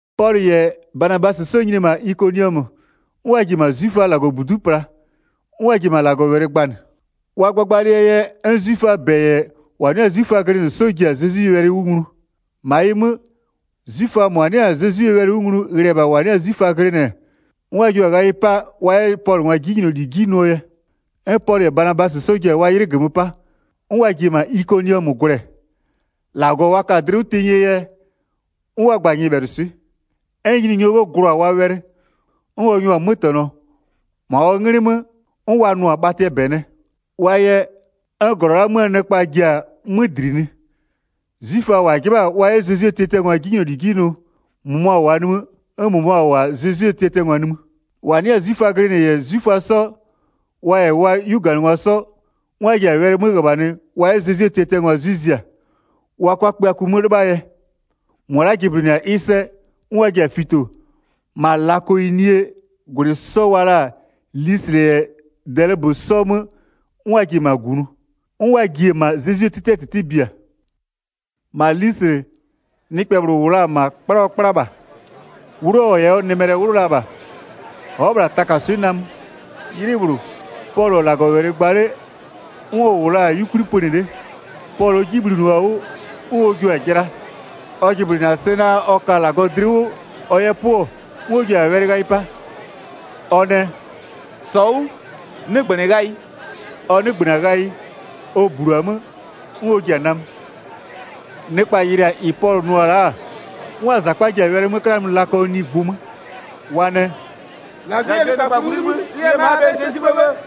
Pɔlʋ -yɛ Banabasɩ 'sɔ nyini-e -ma Ikoniɔmö, 'n wa ji-e -ma 'zwiföaa -Lagɔbudu'u pla, 'n wa ji-e -ma -Lagɔwɛlɩ gbanɩ. Wa gbagbalɩɛ yɛ 'n 'zwiföaa -bɛ -yɛ -wa 'nɩ 'yɛ-a 'zwiföa 'sɔ ji-a Zezwie wɛlɩ 'wʋ nglu. 2-Ma ɩ 'mö, 'zwiföa -mʋa 'nɩ-a Zezwie wɛlɩ 'wʋ nglu ghlɩ-ɛ -bha -wa 'nɩ-a 'zwiföa glɩnɩ, 'n wa jua-a ghayɩ 'pa wa 'yɛ Pɔlʋngwa 'jinyloli 'ji nʋɔ yɛ. 'N Pɔlʋ -yɛ Banabasɩ 'sɔ ji-a wa 'ylɩ -gömö 'pa, 'n wa ji-e -ma Ikoniɔmö gwlɛ. -Lagɔ wa ka-a dlɩ 'wʋ tenyie yɛ, 'n wa gba-a nyɩbhɛlʋswɩ'ɩ. 'N Nyininyɔɔ 'bhë glʋ-a wa wɛlɩ, 'n ɔ nyʋa-a 'mötɛnɔ, -ma ɔ 'nglɩ 'mö 'n wa nʋ-a bhatɩɛ -bɛ nɛ. Wa yɛ, 'n -glɔ la'aa 'möö nɩkpa ji-a 'mö dlinɩ. 'Zwiföa -wa 'jɩbha-a wa 'yɛ Zezwie tiatiangwa 'jinyloli 'ji nʋ, -mʋmʋa -wʋʋa nimï, 'n -mʋmʋa -wʋ-a Zezwie tiatiangwa nimï. 5-Wa 'nɩ-a 'zwiföa glɩnɩ -yɛ 'zwiföa 'sɔ, wa -yɛ wa 'yuganɩngwa 'sɔ, 'n wa ji-a wɛlɩ 'mö -ghöbhanɩ wa 'yɛ Zezwie tiatiangwa 'zwɩ zia, wa 'kʋa kpïaku 'mö 'lɩbhaa yɛ. 6-Mʋa la'a jɩblɩnɩ-a ɩ sɛ, 'n wa ji-a fito, -ma Lakaonie -gwlɩ 'sɔ wa la-a Lislɩ -yɛ Dɛlɩbö 'sɔɔ 'mö, 'n wa ji-e -ma -gunʋ. 'N wa ji-e -ma Zezwie 'tɩtɩɛ -tɩtɩ bia. Pɔlʋngwa yɛ 'kplakplanyɔ -bhlʋ göpö 8-Ma Lislɩ, nɩkpɛ -bhlʋ -wʋ la-a -ma, 'kpla ɔ 'kpla -bha. 'Wlʋ ɔ -yɛ nɩmɛlɛ 'wlʋ la -bha, ɔ'ɔ-ɔ -bhla takaswɩ'ɩ namö. 'Ylɩ -bhlʋ, Pɔlʋ-ɔ -Lagɔwɛlɩ gba 'le, 'n ɔ -wʋɔ la-a 'yukwli pönɩ 'le. Pɔlʋɔ 'ji bhlinɩɔ-a 'wʋ, 'n ɔ jio-a jɩla. Ɔ jɩblɩnɩ-a sɛ naa, ɔ ka -Lagɔ dlɩ 'wʋ ɔ 'yɛ 'pʋ-ɔ, 'n ɔ ji-a wɛlɩ ghayɩ 'pa, ɔ nɛ: “-Sɔ 'wʋ, 'nɩgbönɩ ghayɩ!” Ɔ 'nɩgbönɩ-a ghayɩ, ɔ -blu-a 'mö, 'n ɔ ji-a namö. Nɩkpa yɩlɩ-a -ɩ Pɔlʋ nʋ-ɔ la'a, 'n wa -zakpa ji-a wɛlɩ 'mö 'klanɩ lakaonigbʋ 'mö. Wa nɛ: “-Lagwɩ yɛ nɩkpaklʋɩ 'wʋ 'libhï ɩ yɛ ma'a -aa 'bhɛyɩ sɛ 'sibhë 'bhë!”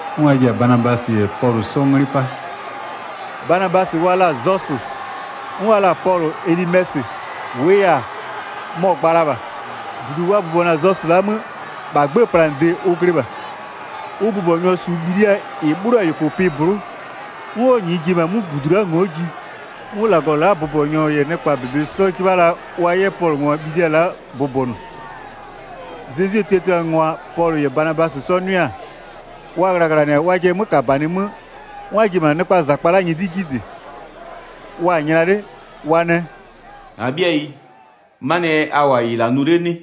'N wa ji-a Banabasɩ -yɛ Pɔlʋ 'sɔ 'nglɩ 'pa. Banabasɩ wa la-a “Zɔsʋ”, 'n wa la-a Pɔlʋ “Ɛlɩmɛsɩ”, -wʋʋ yɛ-a, mɔ-ɔ gba la -bha. 13-Budu wa bʋbɔnʋ-a Zɔsʋ la'a 'mö, -bha 'gbëë planɩde ʋ glɩ -bha. Ʋ bʋbɔnyɔ -su bhilia -ɩ 'bhlɩɔ-a -yʋkʋpɩ -blʋ'ʋ, 'n ɔ -nyɩɩ ji-e -bha 'mʋ -budu la'a a ngo'o ji. 'Mʋ -lagɔ la'aa bʋbɔnyɔ -yɛ nɩkpaa -bebe 'sɔ 'jɩbha la wa 'yɛ Pɔlʋngwa bhilia la'a bʋbɔnʋ. Zezwie tiatiangwa Pɔlʋ -yɛ Banabasɩ 'sɔ 'nʋɩ-a, wa ghlaghlanɩ-a wajɩɛ 'mökabanɩ 'mö, 'n wa ji-e -ma nɩkpaa -zakpa la'a nyɩdɩ 'ji -dɩ. Wa-a nyla 'le, wa nɛ: “-Abhɩayi, 'manɩɛ yɛ a -wʋ-a -ɩ -la nʋ 'le 'nɩ?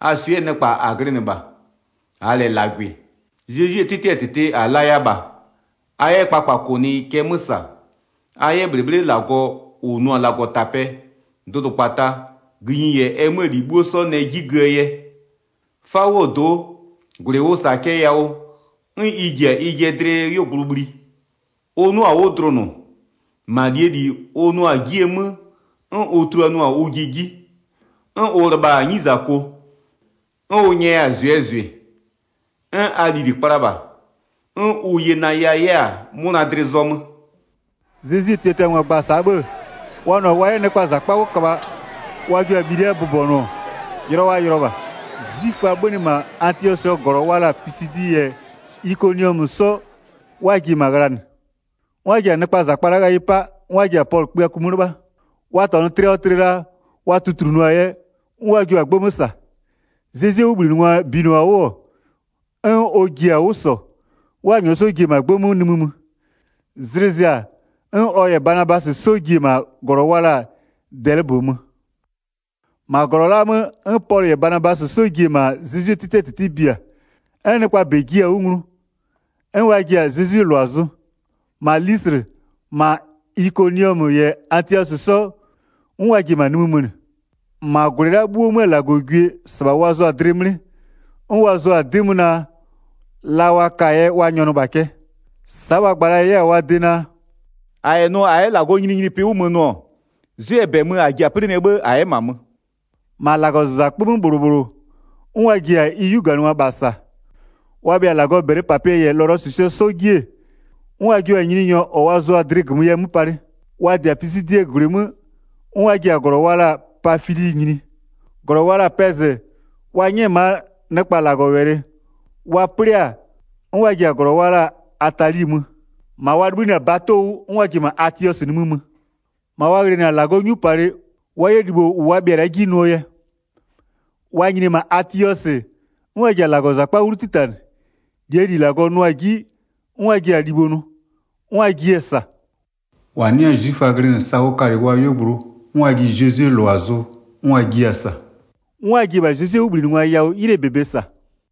A swɩ'ɩɛ nɩkpa -a glɩnɩ -bha, -aa -lɛ -lagwɩ. Zezwie 'tɩtɩɛ -tɩtɩ -a laya -bha, a 'yɛ kpakpakʋnɩ cɛ 'mö -sa, a 'yɛ -bhlɩbhlɩ -Lagɔ -ʋ nʋ-a -Lagɔtapɛ, dʋdʋkpata, gïnyi -yɛ ɛ 'möö -li 'bhuo 'sɔ nɛ 'ji göö yɛ. 'Fawʋɔ do'o, -gwlɩ ʋ -sa-a cɛ yawʋ, 'n ɩ ji-a ɩjɩɛ dlɩɛ 'yuogblʋ bhli. Ʋ 'nʋa-a 'wʋ dlʋnʋ, -ma -lie -li ʋ nʋa-a 'jiee 'mö 'n ʋ tuluanʋa-a ʋjɩ 'ji, 'n ʋ lɩbha-a 'nyizako, 'n ʋ nyɛya-a -zʋɩɛ -zʋɩ, 'n a lili kpla -bha, 'n ʋ yenaya 'yɛ-a 'mʋna dlɩ zɔmö.” Zezwie tiatiangwa gba-a sa'a 'bhë-ë, wa nʋ-a wa 'yɛ nɩkpaa -zakpa 'wʋ köbha wa jua-a bhilia bʋbɔnʋ-ɔ, yʋlɔ wa yʋlɔ -bha. 'Zwiföa 'bhönɩ -ma Atiɔsɩɛ -glɔ wa la-a Pisidi -yɛ Ikoniɔmö 'sɔ 'n wa ji-e -ma ghlanɩ. 'N wa ji-a nɩkpaa -zakpa la'a ghayɩ 'pa 'n wa ji-a Pɔlʋ kpïaku 'mö 'lɩbha. Wa -tɔnʋ tlɩ ɔ tlɩ la, wa tutlunʋɔ-a yɛ, 'n wa jio-a 'gbë 'mö -sa. Zezwie 'wʋbhlinɩngwa binɩɔ-a 'wʋ, 'n ɔ ji-a 'wʋ -sɔ, 'n wa -nyɔɔ 'sɔ ji-e -ma 'gbë 'mö nimï mö. Zlɩ zɩ-a, 'n ɔ -yɛ Banabasɩ 'sɔ ji-e -ma -glɔ wa la-a Dɛlɩbö mö. Pɔlʋngwa yɛ -ma Atiɔsɩ nimï mö 21-Ma -glɔ la'a 'mö 'n Pɔlʋ -yɛ Banabasɩ 'sɔ ji-e -ma Zezwie 'tɩtɩɛ -tɩtɩ bia, 'n nɩkpaa -bɛ jiɩ-a 'wʋ nglu, 'n wa ji-a Zezwie -lʋa zʋ. -Ma Lislɩ, -ma Ikoniɔmö -yɛ Atiɔsɩ 'sɔ, 'n wa ji-e -ma nimï mönɩ. 22-Ma -gwlɩ la'a 'bhuoo 'möö -Lagɔgwie -sɩbha wa zʋa-a dlɩ 'mlɩ, 'n wa zʋa-a 'dɩ 'mö naa, la wa ka-a yɛ wa nyɔnʋ -bha cɛ. Sa'a wa gba la 'yɛ-a wa de naa: “-A -yɛ nʋ -a 'yɛ -Lagɔɔ nyininyinipɩ 'wʋ 'mö nʋ-ɔ, 'zwɩɛ -bɛ mö -a ji-a 'plɩnɩɛ 'bhë -a 'yɛ-a -ma mö.” 23-Ma -Lagɔzakpö 'mö -bhlʋ -bhlʋ, 'n wa ji-a ɩ 'yuganɩngwa -bha -sa. Wa bhɩa-a -Lagɔɔ -bɛlɩpapɩɛ -yɛ lɔlɔsʋsʋɛ 'sɔ 'ji, 'n wa jua-a Nyininyɔ -ɔ wa zʋa-a dlɩ -gömö yɛ 'mö palɩ. Wa -dɩ-a Pisidie -gwlɩ 'mö, 'n wa ji-a -glɔ wa la-a Pafili nyini. 25-Glɔ wa la-a Pɛzɩ wa 'nyɛ-ɛ -maa nɩkpa -Lagɔwɛlɩ, wa 'plɩ-a, 'n wa ji-a -glɔ wa la-a Atali mö. 26-Ma wa 'libhïnɩ-a bato 'wʋ, 'n wa ji-e -ma Atiɔsɩ nimï mö, -ma wa ghlɩnɩ la-a -Lagɔɔ 'nyupalɩ wa 'yɛ libho -ʋ wa bhɩa-a la'a 'ji nʋɔ yɛ. Wa nyini-e -ma Atiɔsɩ, 'n wa ji-a -Lagɔzakpa 'wlu 'titanɩ, -lie -li -Lagɔ nʋʋa-a 'ji 'n wa ji-a libho nʋ, 'n wa jiɩ-a -sa. -Wa 'nɩ-a 'zwiföa glɩnɩ sa ʋ kalɩ wa 'yuogblʋ 'n wa ji Zezwie -lʋa zʋ, 'n wa jiɩ-a -sa. 'N wa ji-e -bha Zezwie 'wʋbhlinɩngwa yawʋ 'ylɩɛ -bebe -sa.